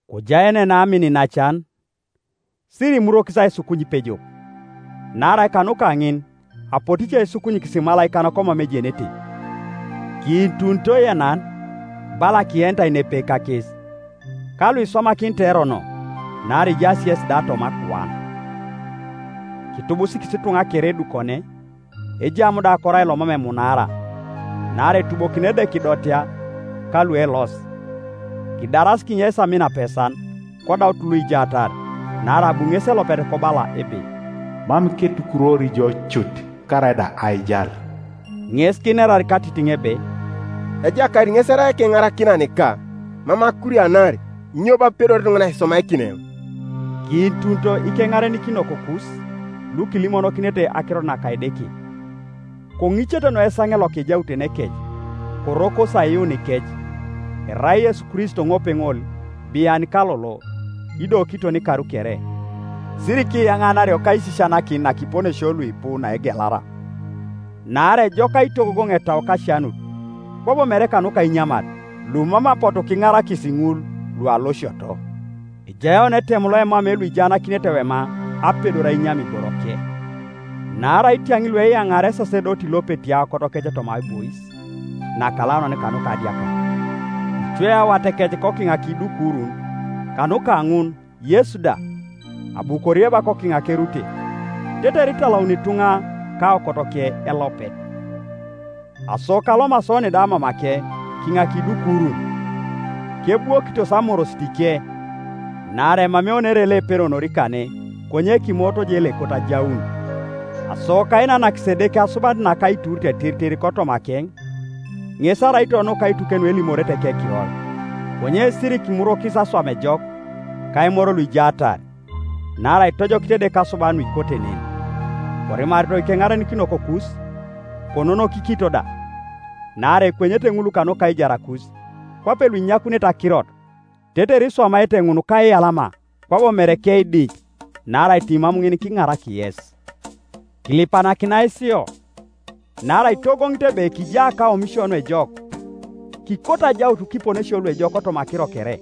Kojaenena amin iinacan. Sirikiimurwokis aisukuny ipejok, naarai kanuka ŋin apotu ice kisukunyikis imalaikan komam ejenete. Kiitunito ienan, bala kienitai nepepe kakes; ka luiswamakinitai erono, naarai ijaas yesi da toma akuan. Kitubusikis ituŋa kere adukokin, ejam da korai lomam emunaara; naarai etubokini Edeke ludotea ka lueelosi. Kidaras kinyeis amin apesan, kodaut luijaatar; naarai abu ŋesi elopet kobala ebe, “Mam ketukurwori jo cut, karaida aijal.” Ŋes kinerar katitiŋ ebe, “Ejakait ŋes erai ekeŋarakinanika, Mam akurianari, Inyo bo epedori ituŋanan aiswamakin eoŋ?” Kiitunito ikeŋarenikinokokus, lukilimonokinete akirot naka Edeke; koŋicete noi esaŋe loka ejautenekec, korokosi aiyuunikec. Erai Yesu Kristo ŋopeŋol bian ka lolo, ido kiton ikar kere. Sirikiyananario kaisisianakin nakiponesio luipu naegelara; naarai ejok aitogogoŋ etau kasianut, kwabo mere kanuka inyamat, lumam apotu kiŋarakis ŋul lualosioto. Ejai oni etem loemamei luijaanakinete ewema apedor ainyam iboroke. Naarai itiaŋ lueyaŋaari esasedoti lopeti aokotokec toma aibois nakalaunan kanuka adiakar, icweio awatekec kokiŋ kiidukurun. Kanuka ŋun Yesu da, abu korieba kokiŋ kerute, tetere italauni ituŋa kaokotoke elopet. Aso kalomasi oni da mamakeŋ kiŋa kiidukurun, kebwokitos amorositike. Naarai emamei oni ere loeperonori kane, konye kimoot je loekot ajaun. Aso kainanakis Edeke asubanit naka aiturit tiritir kotomakeŋ, ŋes araito nuka aituke nuelimorete ekekiror. Konye sirikimurwokis aswam ejok, ka aimor luijaatar, naarai itojokit Edeke asuban nuikote nen. Korimarito ikeŋarenikinokokus, kononokikinito da; naarai ekwenyete ŋul kanuka aijarakus, kwape luinyakunete akirot; tetere iswamaete ŋun kaiyalama kwabo mere keidiny; naarai timam ŋin kiiŋarak yes. Kilipanakinai sio, naarai kitogogoŋit ebe kija kaomisio nuejok, kikoto ajaut kiponesio luejok kotoma akiro kere.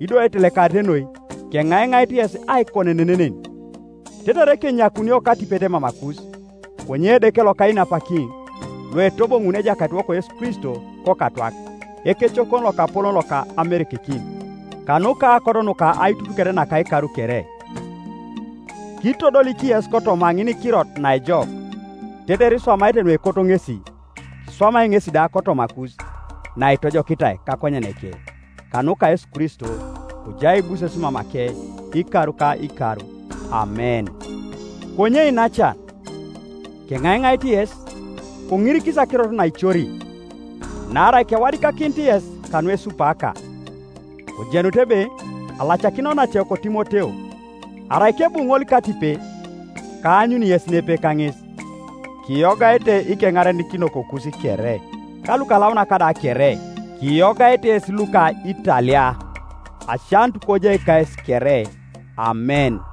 Ido aitelekarit noi keŋaiŋait yes aikonenen nen, tetere kenyakunio katipet mamakus. Konye Edeke lokainapakin, loetoboŋuni Ejakaitiwok Yesu Kristo kokatwak, ekecokon lokapolon loka amerekekin, kanuka aokot nuka aitutuket naka ikar kere, kitodolik yes kotoma kaŋinikirot naejok, tetere iswamaete nuekot ŋesi, kiswamai ŋesi da kotomakus naitojokitai kakonyeneke, kanuka Yesu Kristo; kojai aibuses mamakeŋ ikar ka ikar. Amen. Konye iinacan, keŋaiŋait yes, koŋirikis akirot naicori, naarai kewadikakinit yes kanuesupaaka. Kojenutu ebe alacakin onacewok Timoteo. Arai kebu ŋol katipet, kaanyuni yes nepepe kaŋes. Kiyogaete ikeŋarenikinokokus kere, ka lukalaunak da kere. Kiyogaete yes luko Italia. Asianut kojai kayes kere, Amen.